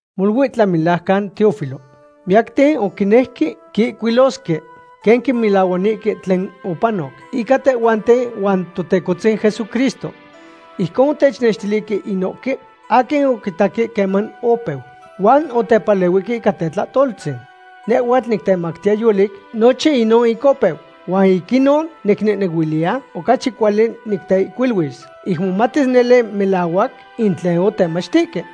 Molui tlamelajcan Teófilo, miyacten oquinejque quihcuilosque quen quimelahuanihque tlen opanoc ica tehhuanten huan Totecohtzin Jesucristo. Ijcon otechnextilihque inohque aquin oquitaque queman opeu huan otepalehuihque ica tetlahtoltzin. Nehhuatl nictemactiya yolic nochin inon ic opeu, huan ic inon nicnehnehuiliya ocachi cuali niteihcuiluis ic momatis nele melahuac in tlen otemachtihque.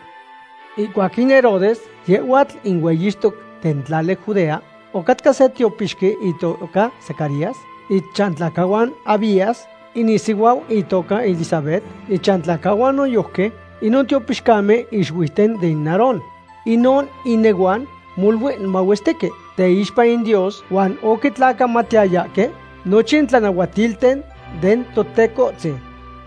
Ihcuac in Herodes yehhuatl in hueyixtoc den tlali Judea, ocatca se tiopixqui itoca Zacarías, ichantlacahuan Abías. In isihuau itoca Elisabet, ichantlacahuan noyojqui inon tiopixcamen ixuiuten den Aarón. Inon inehuan molui mahuestique teixpa in Dios huan oquitlacamatiyayahque nochin tlanahuatilten den Totecohtzin.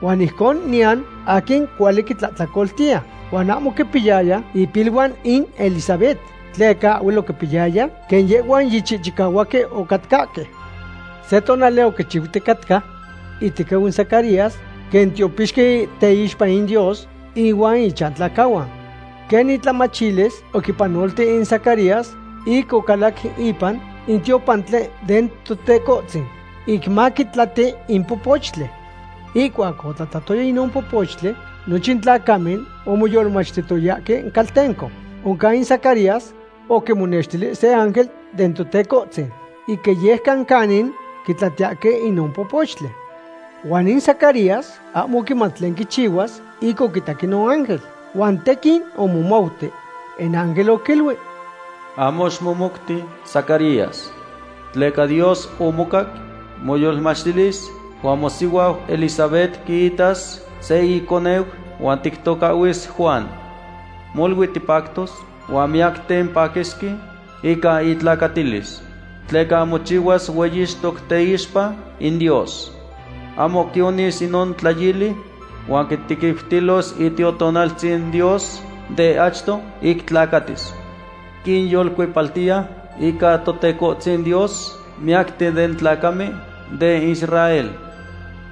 Huan ijcon niyan aquin cuali quintlahtlacoltiya. Huan ahmo oquipiyaya ipiluan in Elisabet tleca ahhuel oquitayaya quen yehhuan yichihchicahuahque ocatcahque. Se tonali oquichiuticatca itequiu in Zacarías quen tiopixqui teixpa in Dios ihuan ichantlacahuan. Quen intlamachilis, oquipanolti in Zacarías ic ocalac ipan in tiopantli den Totecohtzin ic maquitlati in popochtli. Ihcuac otlatlatoya inon popochtli, nochin tlacamen omoyolmachtihtoyahque caltenco. Oncan in Zacarías oquimonextili se ángel den Totecohtzin ic iyejcan canin quitlatiyahque inon popochtli. Huan in Zacarías ahmo oquimat tlen quichihuas ic oquitac inon ángel, huan tequin omomouti. In ángel oquiluic: ―Ahmo ximomouti, Zacarías. Tleca Dios omocac moyolmachtilis huan mosihuau Elisabet quiitas se iconeu huan tictocahhuis Juan. Molui tipactos huan miyacten paquisque ica itlacatilis. Tleca mochihuas hueyixtoc teixpa in Dios. Ahmo quionis inon tlayili huan quitequiutilos Itiotonaltzin Dios de achto ic tlacatis. Quinyolcuepaltiya ica Totecohtzin Dios miyacten den tlacamen den Israel.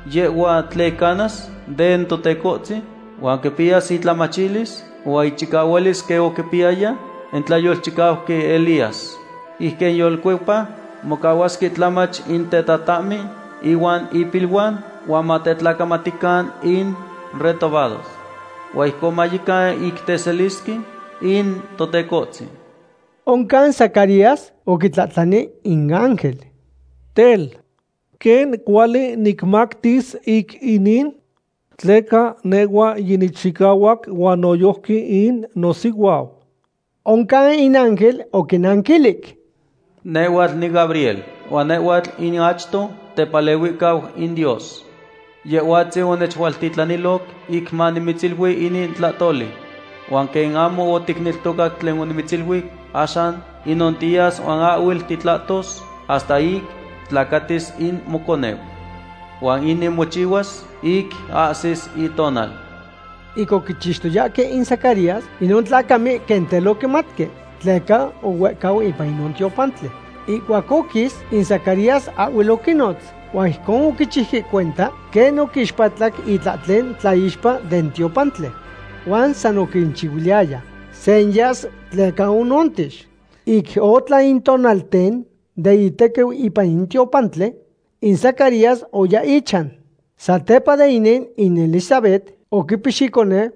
Yehhua tlicanas den Totecohtzin huan quipiyas itlamachilis huan ichicahualis quen oquipiyaya in tlayolchicauqui Elías. Ic quinyolcuepa mocahuasque tlamach in tetatahmen inuan ipiluan huan matetlacamatican in retobados. Huan ijcon mayecan ic teselisque in Totecohtzin. Oncan Zacarías oquitlahtlani in ángel: ―Tel, ¿quen cuali nicmatis ic inin? Tleca nehhua yinichicahuac huan noyojqui in nosihuau. Oncan in ángel oquinanquilic: ―Nehhuatl niGabriel, huan nehhuatl in achto tepalehuihcau in Dios. Yehhuatzin onechualtitlaniloc ic manimitzilui inin tlahtoli. Huan quen ahmo oticneltocac tlen onimitziluic, axan tinontiyas huan ahhuel titlahtos hasta ic tlacatis in moconeu. Huan inin mochihuas ic ahsis itonal. Ic oquichixtoyahque in Zacarías, inon tlacamen quen tel oquimatque tleca ohuehcau ipan inon tiopantli. Ihcuac oquis, in Zacarías ahhuel oquinnotz, huan ijcon oquichiuque cuenta quen oquixpatlac itlahtlen tlaixpa den tiopantli. Huan sa oquinchihuiliyaya senyas tleca onontix. Ic otlan in tonalten den itequiu ipan in tiopantli, in Zacarías oya ichan. Satepa de inin in Elisabet oquipix iconeu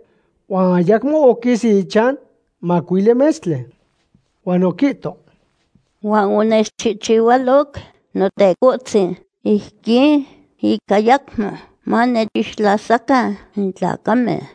huan ayacmo oquis ichan macuili metztli. Huan oquihto: ―Huan onechchihualoc Notecohtzin ijquin, ic ayacmo manechixtlasacan in tlacamen.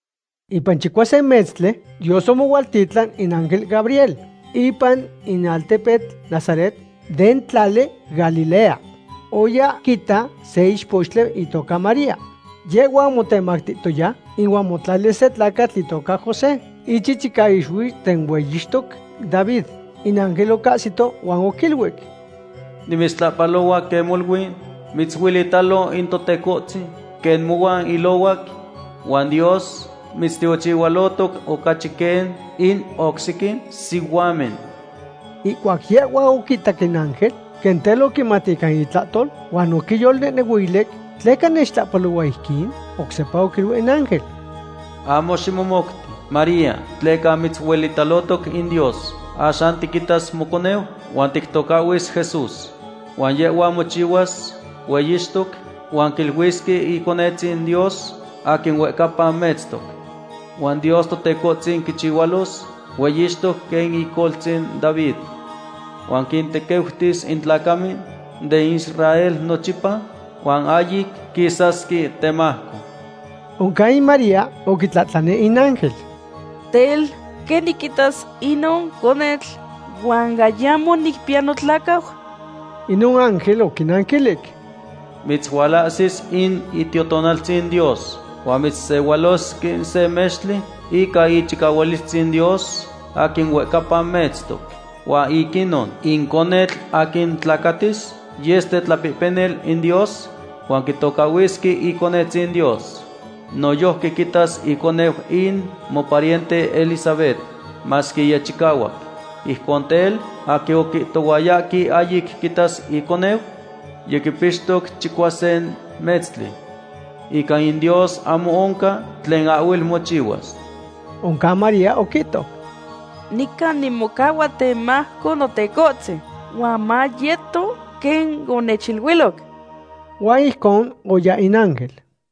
Ipan chicuasin metztli Dios omohualtitlan in ángel Gabriel ipan in altepetl Nazaret den tlali Galilea. Oya quita se ichpochtli itoca María. Yehhua omotemacatoya ihuan motlalis se tlacatl itoca José, ichichicaixuiu den hueyixtoc David. In ángel ocahsito huan oquiluic: ―¡Nimitztlahpalohua quen molui mitzuelitalo in Totecohtzin, quen mohuan ilohuac! Huan Dios mitztiochihualotoc ocachi quen in oc sequin sihuamen. Ihcuac yehhua oquitac in ángel, quen tel oquimat ica itlahtol huan oquiyolnehnehuilic: ¿Tleca nechtlahpalohua ijquin? Oc sepa oquiluic in ángel: ―Ahmo ximomouti, María, tleca mitzuelitalotoc in Dios. Axan tiquitas moconeu huan tictocahhuis Jesús. Huan yehhua mochihuas hueyixtoc, huan quiluisque Iconetzin Dios aquin huehcapa metztoc. Huan Dios Totecohtzin quichihualos hueyixtoc quen icoltzin David. Huan quintequiutis in tlacamen den Israel nochipa, huan ahyic quisasque temajco. Oncan in María oquitlahtlani in ángel: ―Tel, ¿quen niquitas inon conetl, huan ayamo nicpiya notlacau? Inon ángel oquinanquilic: ―Mitzualahsis in Itiotonaltzin Dios huan mitzsehualos quen se mextli ica ichicahualistzin Dios aquin huehcapa metztoc. Huan ic inon, in conetl aquin tlacatis yes tetlapehpenil in Dios huan quitocahhuisque Iconetzin Dios. Noyojqui quitas iconeu in mopariente Elisabet, masque yichicahuac. Ijcon tel, aquin oquihtohuayahque ahyic quitas iconeu yiquipixtoc chicuasin metztli. Ica in Dios ahmo oncan tlen ahhuel mochihuas. Oncan María oquihto: ―Nican nimocahua temajco Notecohtzin, huan mayeto quen onechiluiloc. Huan ijcon oya in ángel.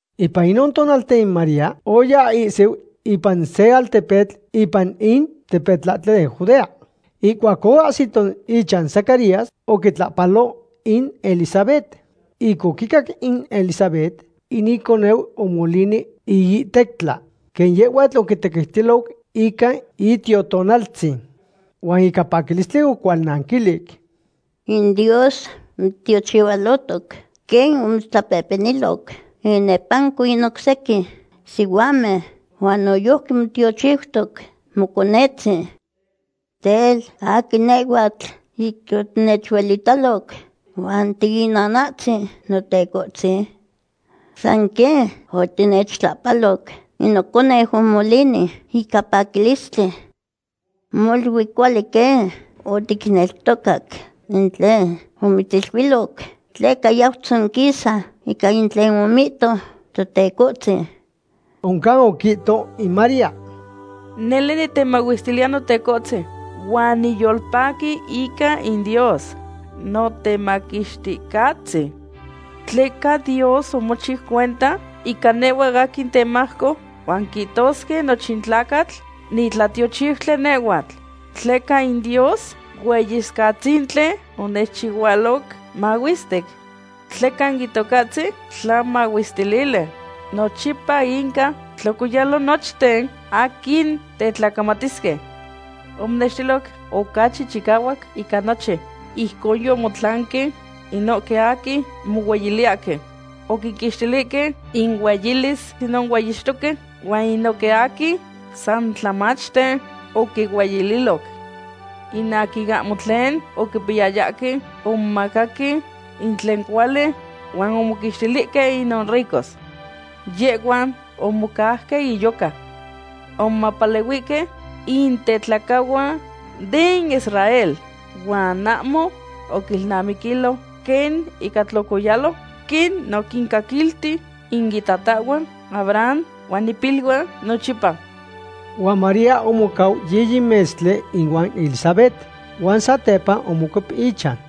Ipan inon tonalten María oya ihsiu ipan se altepetl ipan in tepetlahtli den Judea. Ihcuac oahsito ichan Zacarías oquitlahpalo in Elisabet. Ic oquicac in Elisabet, in iconeu omolini iihtectla, quen yehhuatl oquitequiutiloc ica Itiotonaltzin. Huan ica paquilistli ocualnanquilic: ―In Dios mitztiochihualotoc quen omitztlapehpeniloc inepanco in oc sequin sihuamen huan noyojqui motiochiutoc moconetzin. Tel, ¿aquin nehhuatl, ic otinechualitac huan tiinanahtzin Notecohtzin? San quen otinechtlahpaloc, in noconeu omolini ica paquilistli. Molui cuali quen oticneltocac in tlen omitziluiloc tleca yau tzonquisa ica in tlen omihto Totecohtzin. Oncan oquihto in María: ―Nele nitemahuestiliya Notecohtzin, huan niyolpaqui ica in Dios Notemaquixticahtzin. Tleca Dios omochiu cuenta ica nehhua aquin temajco, huan quihtosque nochin tlacatl nitlatiochiutli nehhuatl. Tleca in Dios Hueyicahtzintli onechchihualoc mahuestic; tleca in Itocahtzin tlamahuestilili. Nochipa inca tlocoyalo nochten aquin tetlacamatisque. Omonextiloc ocachi chicahuac ica nochin. Ijcon yomotlanque inohque aquin mohueyiliyahque. Oquinquixtilihque inueilis inon hueyixtoque huan inohque aquin san tlamachten oquinueyililoc. In aquin ahmo tlen oquipiyayahque, omomacaque in tlen cuali, huan omoquixtilihque inon ricos. Yehhuan omocauque inyoca. Omopalehuihque in tetlacahuan den Israel huan ahmo oquinilnamiquilo quen inca tlocoyalo, quen oquincaquilti in itatahhuan Abraham huan ipiluan nochipa. Huan María omocau yiyi metztli ihuan Elisabet huan satepa omocuep ichan.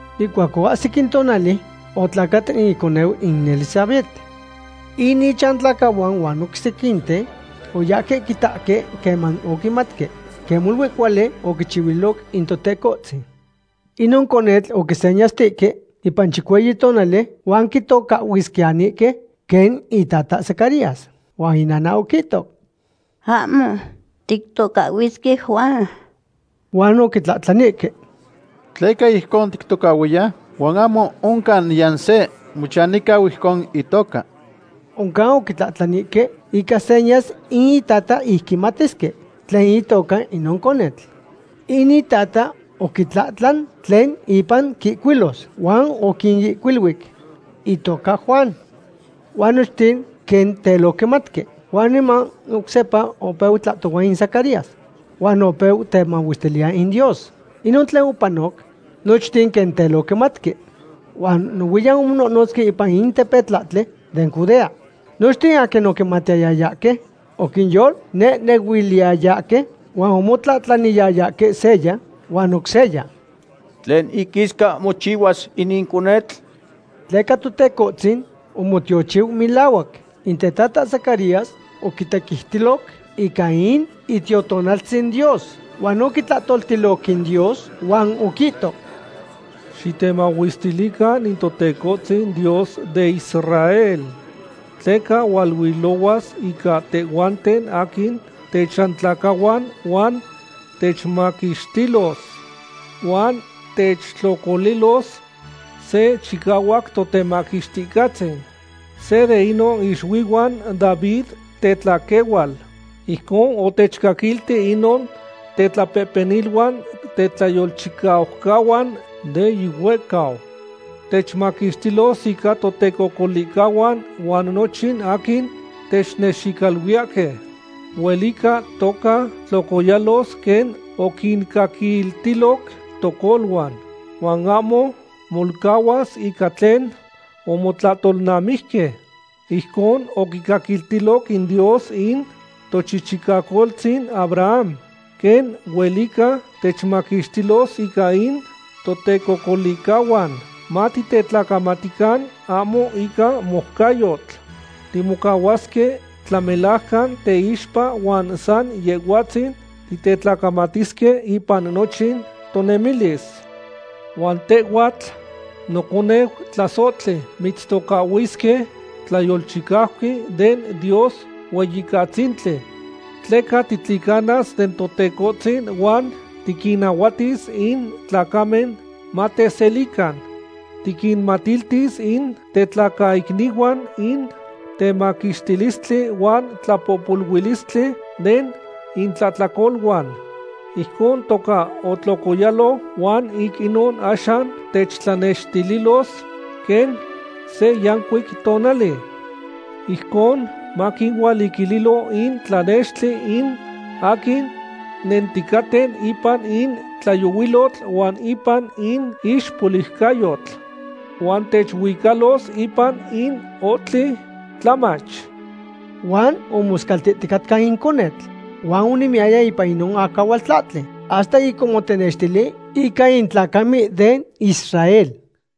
Ihcuac oahsic in tonali, otlacat iconeu in Elisabet. In ichantlacahuan huan oc sequinten oyahque quitahque queman oquimatque quen molui cuali oquichihuililoc in Totecohtzin. Inon conetl oquisenyastihque ipan chicueyi tonali huan quitocahhuisquiyanihque quen itata Zacarías. Huan inana oquihto: ―Ahmo. Tictocahhuisque Juan. Huan oquitlahtlanihque: ―¿Tleca ijcon tictocahhuiya? Huan ahmo oncan niyan se mochanihcau ijcon itoca. Oncan oquitlahtlanihque ica senyas in itata ic quimatisque tlen itoca inon conetl. In itata oquitlahtlan tlen ipan quihcuilos, huan oquinihcuiluic: “Itoca Juan.” Huan nochten quen tel oquimatque. Huan niman oc sepa opeu tlahtohua in Zacarías huan opeu temahuestiliya in Dios. Ica inon tlen opanoc, nochten quen tel oquimatque huan nohuiyan omononotzque ipan in tepetlahtli den Judea. Nochten aquin oquimatiyayahque oquiyolnehnehuiliyayahque huan omotlahtlaniyayahque seya huan oc seya: ―¿Tlen iquisca mochihuas inin conetl? Tleca Totecohtzin omotiochiu melahuac. In tetata Zacarías oquitequiutiloc ica in Itiotonaltzin Dios huan oquitlahtoltiloc in Dios huan oquihto: Xitemahuestilican in Totecohtzin Dios den Israel. Tleca hualuilohuas ica tehhuanten aquin techantlacahuan huan techmaquixtilos. Huan techtlocolilos se chicahuac Totemaquixticahtzin. Se de inon ixuihuan David tetlaquehual. Ijcon otechcaquilti inon tetlapehpeniluan tetlayolchicaucahuan de yihuehcau. Techmaquixtilos ica totecocolihcahuan huan nochin aquin technexicaluiyahque. Huelica toca tlocoyalos quen oquincaquiltiloc tocoluan, huan ahmo molcahuas ica tlen omotlahtolnamijque. Ijcon oquicaquiltiloc in Dios in tochichicacoltzin Abraham. Quen huelica techmaquixtilos ica in totecocolihcahuan, matitetlacamatican ahmo ica moucayotl. Timocahuasque tlamelajcan teixpa huan san Yehhuatzin titetlacamatisque ipan nochin tonemilis. Huan tehhuatl, noconeu tlasohtli, mitztocahhuisque tlayolchicauqui den Dios Hueyicatzintli. Tleca titlicanas den Totecohtzin huan tiquinnahuatis in tlacamen mateselican. Tiquinmatiltis in tetlacaicnihuan in temaquixtilistli huan tlapohpoluilistli den intlahtlacoluan. Ijcon toca otlocoyalo huan ic inon axan techtlanextililos quen se yancuic tonali. Ijcon maquinualiquililo in tlanextli in aquin nenticaten ipan in tlayohuilotl huan ipan in ixpoliucayotl. Huan techuicalos ipan in ohtli tlamach. Huan omoscaltihticatca in conetl huan onemiyaya ipan inon acahualtlahtli hasta ic omotenextili ica in tlacamen den Israel.